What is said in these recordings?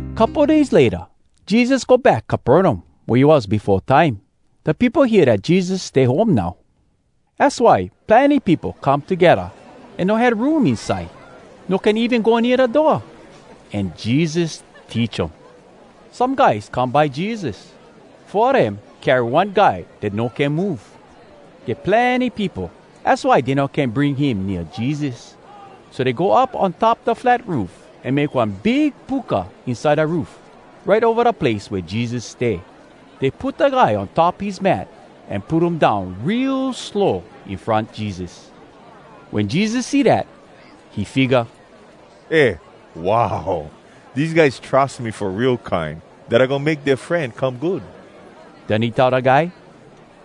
Couple days layta, Jesus go back Capernaum wea he was befo time. Da peopo hear dat Jesus stay home now. Az why plenny peopo come togedda an no had room inside. No can even go nea da door. An Jesus teach um. Some guys come by Jesus. Four a dem carry one guy dat no can move. Get plenny peopo, az why dey no can bring him nea Jesus. So dey go up on top da flat roof, an make one big puka inside da roof, right ova da place wea Jesus stay. Dey put da guy on top his mat an put um down real slow in front Jesus. Wen Jesus see dat, he figga, “Eh, wow! Dese guys trus me fo real kine, dat I goin make dea fren come good!” Den he tell da guy,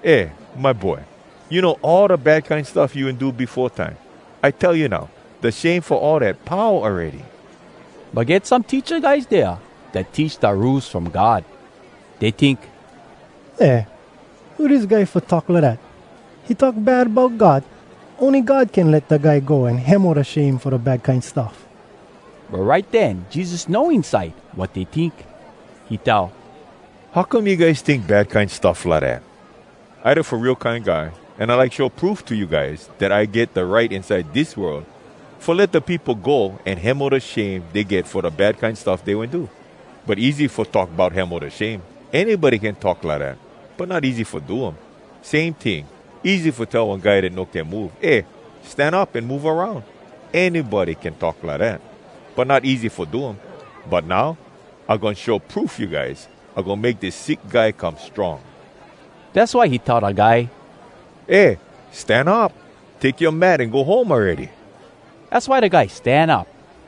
“Eh, my boy, you know all da bad kine stuff you wen do befo time? I tell you now, da shame fo all dat, pau awready!” But get some teacha guys dea dat teach da Rules From God. Dey tink, “Eh! Who dis guy fo talk lidat! He talk bad bout God! Ony God can let da guy go an hemo da shame fo da bad kine stuff!” But right den Jesus know inside wat dey tink. He tell, “How come you guys tink bad kine stuff lidat? I da Fo Real Kine Guy, an I like show proof to you guys, dat I get da right inside dis world, fo let da peopo go an hemo da shame dey get fo da bad kine stuff dey wen do. But, easy fo talk bout hemo da shame—anybody can talk lidat. But not easy fo do um. Same ting, easy fo tell one guy dat no can move, ‘Eh, stan up an move aroun!’—anybody can talk lidat. But not easy fo do um. But now, I goin show proof you guys—I goin make dis sick guy come strong.” Dass why he tell da guy, “Eh, stan up! Take yoa mat an go home awready!” Az why da guy stan up,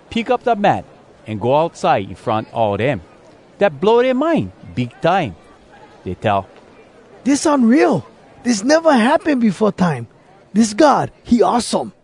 pick up da mat an go outside in front all dem. Dat blow dea mind big time. Dey tell, “Dis unreal! Dis neva happen befo time. Dis God, he awesome!”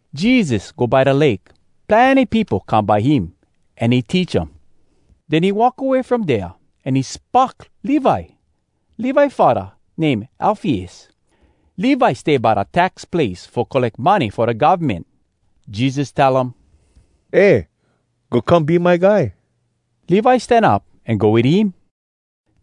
Jesus go by da lake. Plenny peopo come by him, an he teach um. Den he walk away from dea, an he spock Levi. (Levi faddah name Alfeus.) Levi stay by da tax place fo colleck money fo da govmen. Jesus tell him, “Eh! Go come be my guy!” Levi stan up an go wit him.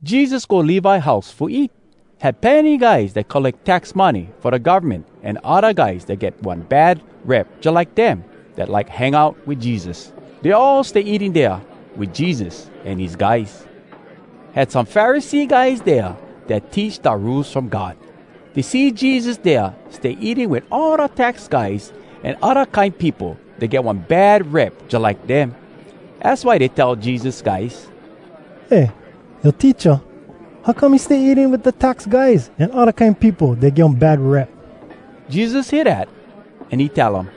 Jesus go Levi house fo eat. Had plenny guys dat colleck tax money fo da govmen an odda guys dat get one bad rep jalike dem, dat like hang out wit Jesus. Dey all stay eating dea wit Jesus an his guys. Had some Pharisee guys dea dat teach da Rules From God. Dey see Jesus dea stay eating wit all da tax guys an odda kine peopo dat get one bad rep jalike dem. Az why dey tell Jesus guys, “Eh, yoa teacha, how come he stay eating wit da tax guys an odda kine peopo dat get one bad rep?” Jesus hear dat, an he tell dem,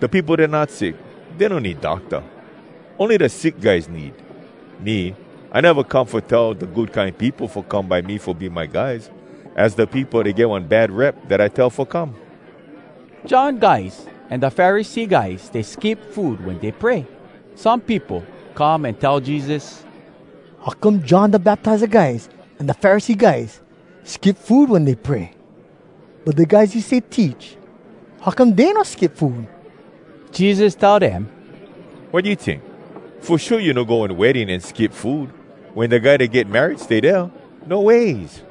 “Da peopo dat not sick, dey no need docta. Ony da sick guys need. Me, I neva come fo tell da good kine peopo fo come by me fo be my guys. Az da peopo dat get one bad rep dat I tell fo come.” John guys an da Pharisee guys stay skip food wen dey pray. Some peopo come an tell Jesus, “How come John Da Baptiza guys an da Pharisee guys skip food wen dey pray, but da guys you stay teach, how come dey no skip food?” Jesus tell dem, “Wat you tink? Fo shua you no go one wedding an skip food, wen da guy dat get married stay dea? No ways!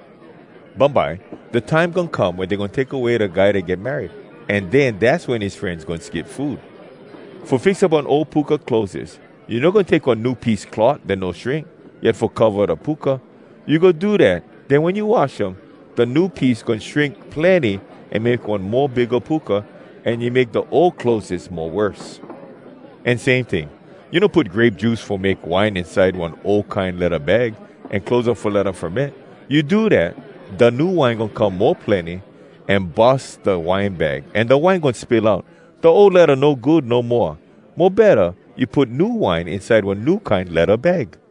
Bumbye, da time goin come wen dey goin take away da guy dat get married. An den, dass wen his frenz goin skip food. “Fo fix up one ol puka clothes, you no goin take one new piece cloth dat no shrink yet fo cova da puka. You go do dat, den wen you wash um, da new piece goin shrink plenny an make one mo bigga puka, an you make da ol clothes mo worse. “An same ting, you no put grape juice fo make wine inside one ol kine ledda bag, an close um fo let um ferment. You do dat, da new wine goin come mo plenny an bus da wine bag, an da wine goin spill out. Da ol ledda no good no moa. Mo betta, you put new wine inside one new kine ledda bag.”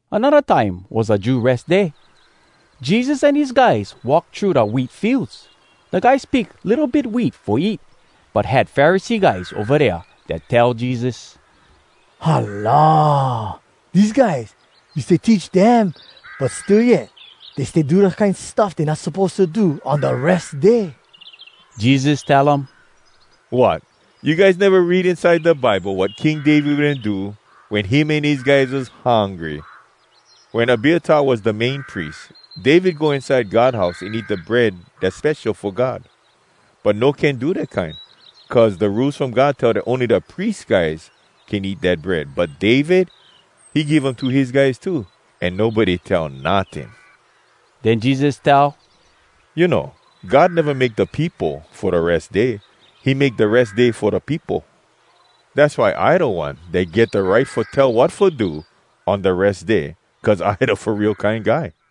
Anodda time was da Jew Res Day. Jesus an his guys walk thru da wheat fields. Da guys pick litto bit wheat fo eat. But had Pharisee guys ova dea dat tell Jesus, “Hala! Dese guys, you stay teach dem, but still yet dey stay do da kine stuff dey not suppose to do on da Res Day!” Jesus tell um, “Wot! You guys neva read inside da Bible wat King David wen do wen him an his guys was hungry? Wen Abiatar was da Main Pries, David go inside God house an eat da bread dass spesho fo God. But no can do dat kine, cuz da Rules From God tell dat ony da pries guys can eat dat bread. But David, he give um to his guys too, an nobody tell notting.” Den Jesus tell, “You know, God neva make da peopo fo da Res Day. He make da Res Day fo da peopo. Dass why I da One dat get da right fo tell wat fo do on da Res Day, cuz I da Fo Real Kine Guy.”